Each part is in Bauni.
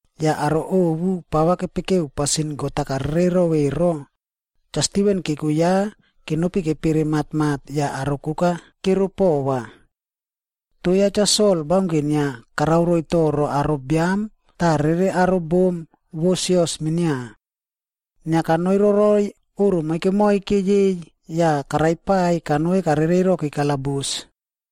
Yah aro ovu pava kepekeu pasin God-a karerero ero, Cha Stiven keko ya kenopi kepere matmat yah aro koka kero pova. Toh ya Cha Sol baunke inia karao roiy toro aro biam tah rere aro bom vo sios minia. Inia kanoi roroiy oꞌro moike moike yei yah karaipaiy kanoi karereiroki kalabus.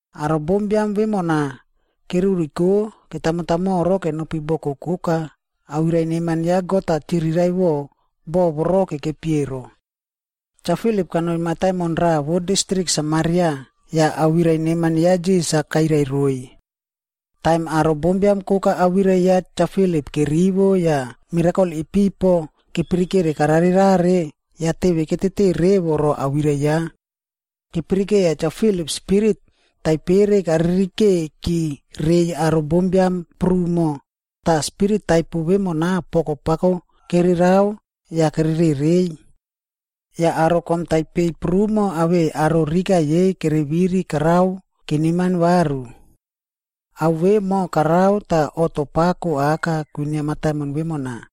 Aro bombiam vemona keruriko ketamotamoro kenopi boko koka, awirai neman ya God-a chiriraiꞌvo boꞌo voro kekepi ero. Cha Filip kanoi mataimon raꞌa vo distrik Samaria yah awirai neman ya Krais-a kairai roiy. Taim aro bombiam koka awirai ya Cha Filip kerivo yah mirakol ipipo kepirikere kararerare, yah teve ketete revo ro awirai ya. Kepirikeiya Cha Filip spirit taipere karirikeiki reiy aro bombiam prumo, tah spirit taipo vemona poko pako kererao yah kererereiy. Yah aro kom taipei prumo awei aro rika yei kereviri karao keneman varu. Ao vemo korao tah oꞌto pako aka kwinia mataimon vemona.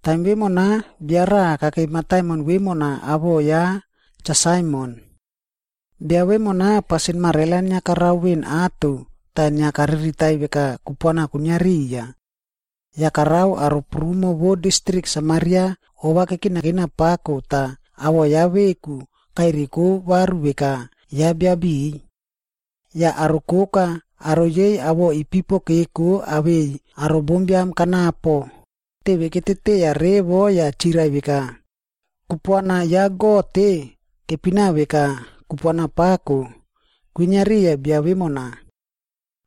Taim vemona, bia raꞌa kakei mataimon vemona awoꞌo ya Cha Saimon. Bia vemona pasin marela inia karao veꞌen ato tah inia kariritaiy veka kupuana kwinia riya. Yah karao aro prumo vo distrik Samaria ova kekinakina pako tah awoꞌo ya veku kaireko varu veka ya bia biꞌiy. Yah aro koka, aro yei awoꞌo ipipo keko awei aro bombiam kanapo, teve keteteiya revo yah chirai veka, “Kupuana ya God-e, kepina veka Kupuana Pako, kwinia riya bia vemona.”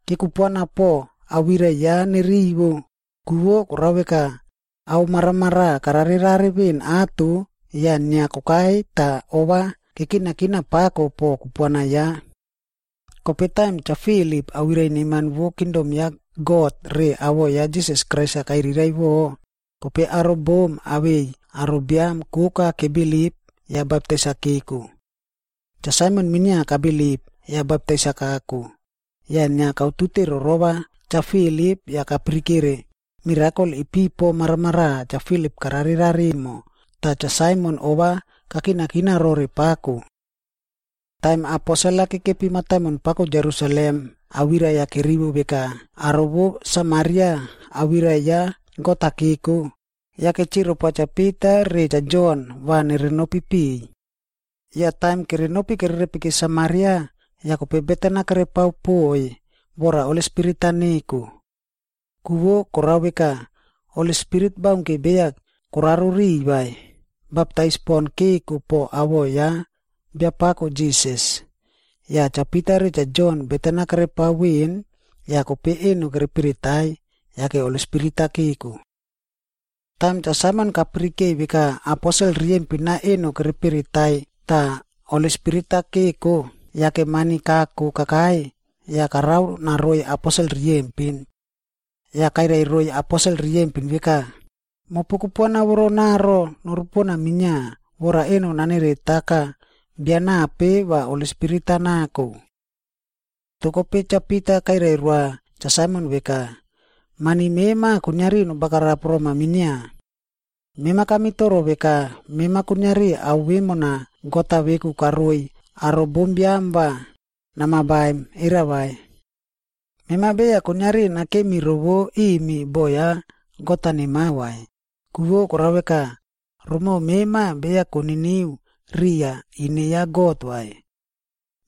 Kekupuana po awirai ya nerivo, ku vo korao veka, ao maramaraꞌa kararerare veꞌen ato yah inia kokai tah ova kekinakina pako po kupuana ya. Kope taim Cha Filip awirai neman vo kingdom ya God re awoꞌo ya Jisas Krais-a kairiraiꞌvo, kope aro bom awei aro biam koka kebilip yah baptais-a keko. Cha Saimon minia kabilip, yah baptais-a kako. Yah inia kautute rorova Cha Filip yah kapirikere mirakol ipipo maramaraꞌa Cha Filip kararerare emo, tah Cha Saimon ova kakinakina rore pako. Taim aposel-a kekepi mataimon pako Jerusalem awirai-a kerivo veka aro vo Samaria awirai ya God-a keko, yake chirai poa Cha Pita re Cha Jon va nerenopi piꞌiy. Yah taim kerenopi kererepiki Samaria, yah kope beten-a kerepao poꞌoiy vora Holi Spirit-a neko. Ku vo korao veka, Holi Spirit baunke beya koraro riꞌiy vai, baptais pon keko po awoꞌo ya Biapako Jisas. Yah Cha Pita re Cha Jon beten-a kerepao veꞌen yah kope eno kereperetai, yake Holi Spirit-a keko. Taim Cha Saimon kapirikeiy veka aposel riyempin-a eno kereperetai tah Holi Spirit-a keko, yake mani kako kakai yah karao naroiy aposel riyempin. Yah kairai roiy aposel riyempin veka, “Mopu kupuana voronaro norupona minia, vora eno naneretaka bia nape va Holi Spirit-a nako.” Toh kope Cha Pita kairai roa Cha Saimon veka, “Mani mema kuiniari nobagarap roma minia. Mema kamitoro veka mema kuiniari ao vemona God-a veku karoiy aro bombiam va nama baim, era vai? Mema beya kuiniari nakemi rovo imi boꞌo ya God nemao vai, ku vo korao veka, romoꞌo mema beya koniniu riya ine ya God vai.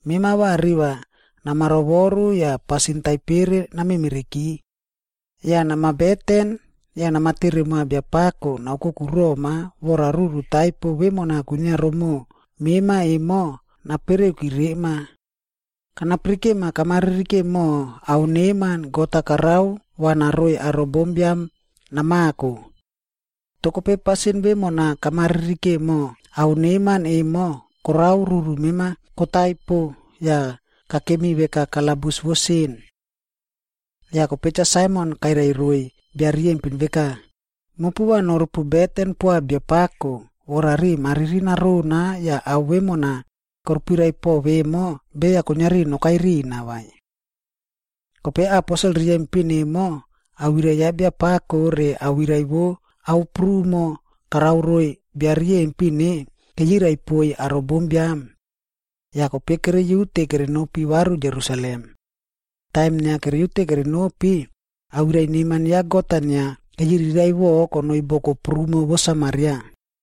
Mema va riva nama rovoru yah pasin taipere namemereki. Yah nama beten yah nama tere moa Biapako naoukoku roma vora ruru taipo vemona kwinia rimoꞌo mema emo napereuki rema. Kanapirikema kama ririke moho ao neman, God-a karao va naroiy aro bombiam namako. Toh kope pasin vemona kama ririke moho ao neman emo korao ruru mema kotaipo yah kakemi veka kalabus vo sin.” Yah kope Cha Saimon kairai roiy bia riyempin veka, “Mopu va norupu beten poa Biapako vora riꞌi mariri narona yah ao vemona korupirai po vemo beya kuiniari nokai rina vai.” Kope aposel riyempin emo, awirai ya Biapako re awirai vo ao prumo karao roiy riyempin-e keyirai poiy aro bombiam. Yah kope keriute kerenopi varu Jerusalem. Taim inia keriute kerenopi, awirai neman ya God-a inia keyiriraiꞌvo konoi boko prumo vo Samaria.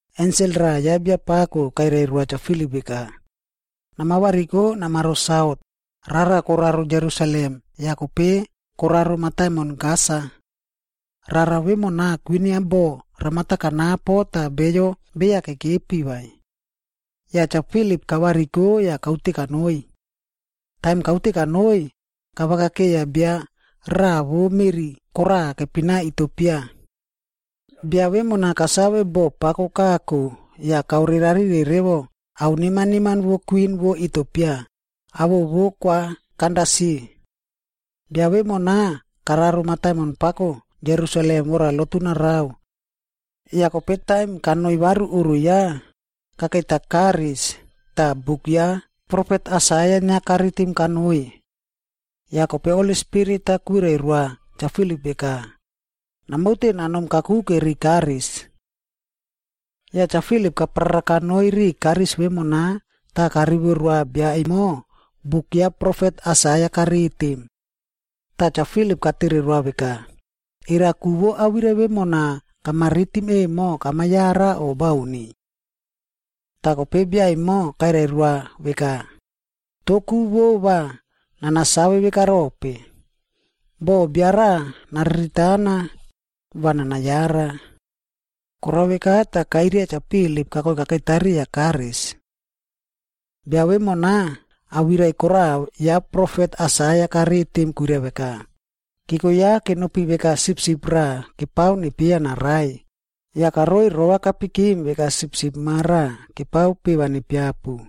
Ensel raꞌa ya Biapako kairai roa Cha Filip veka, “Nama variko namaro saut, rara koraro Jerusalem yah kope koraro mataimon Gasa.” Rara vemona kwinia bo ramata kanapo tah beyo beya kekepi vai. Yah Cha Filip kavariko yah kaute kanoi. Taim kaute kanoi, kavakakeiya bia raꞌa vo meꞌri koraꞌa kepina Itiopia.a Bia vemona kasave boꞌo pako kako yah kaore rari revo ao neman neman vo kwin vo Itiopia, awoꞌo vo Kwa Kandasi. Bia vemona kararo mataimon pako Jerusalem vora lotu narao. Yah kope taim kanoi varu oꞌro ya, kakeita karisb ya tah buk ya profet Aisaia inia karitim kanoi. Yah kope Holi Spirit-a kwirai roa Cha Filip veka, “Namaute namom kakuke ri karis.” Yah Cha Filip kaprara kanoi ri karis vemona tah karivo roa bia emo buk ya profet Aisaia karitim. Tah Cha Filip katere roa veka, “Era ku vo awirai vemona kama ritim emo kama yara o bauni?” Tah kope bia emo kairai roa veka, “Toh ku vo va nana save vekarope? Boh bia raꞌa nariritana va nana yara.” Korao veka tah kairia Cha Filip kakoi kakeita riya karis. Bia vemona awirai koraꞌa ya profet Aisaia karitim kwirai veka, “Keko ya kenopi veka sipsip raꞌa kepao nepieya narai, yah karoi rova kapikim veka sipsip ma raꞌa kepao peꞌe va nepiapu.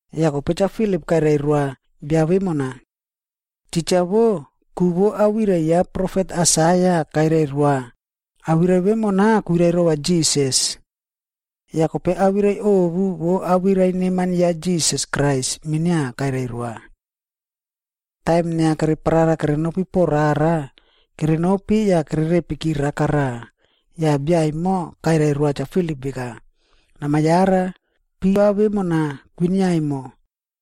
Yah kope Cha Filip kairai roa bia vemona. Titja wo, ku vo awirai ya profet Aisaia kairai roa, awirai vemona kwirai rova Jisas. Yah kope awirai ovu vo awirai neman ya Jisas Krais minia kairai roa. Taim inia kereparara kerenopi po rara, kerenopi yah kererepiki raka raꞌa, yah bia emo kairai roa Cha Filip veka, “Nama yara, piva vemona kwinia emo.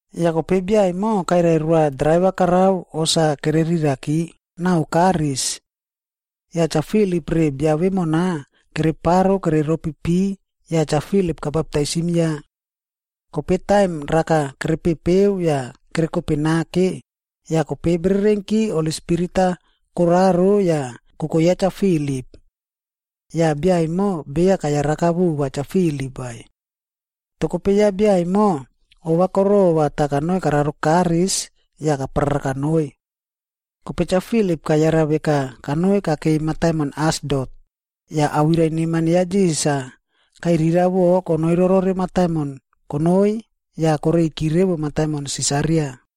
Yah kope bia emo kairai roa draiva karao hos-a kereriraki nao karis. Yah Cha Filip re bia vemona kereparo kereropi pi yah Cha Filip kabaptaisim ya. Kope taim raka kerepepeu yah kerekope nake, yah kope bererenki Holi Spirit-a koraro yah koko ya Cha Filip. Yah bia emo beya kayaraka vova Cha Filip vai. Toh kope ya bia emo, ova korova yah kanoi kararo karis yah kaprara kanoi. Kope Cha Filip kayara veka kanoi kakei mataimon Asdot, yah awirai neman ya Jisas-a kairiraiꞌvo konoi rorore mataimon kanoi yah kareiki revo mataimon Sisaria.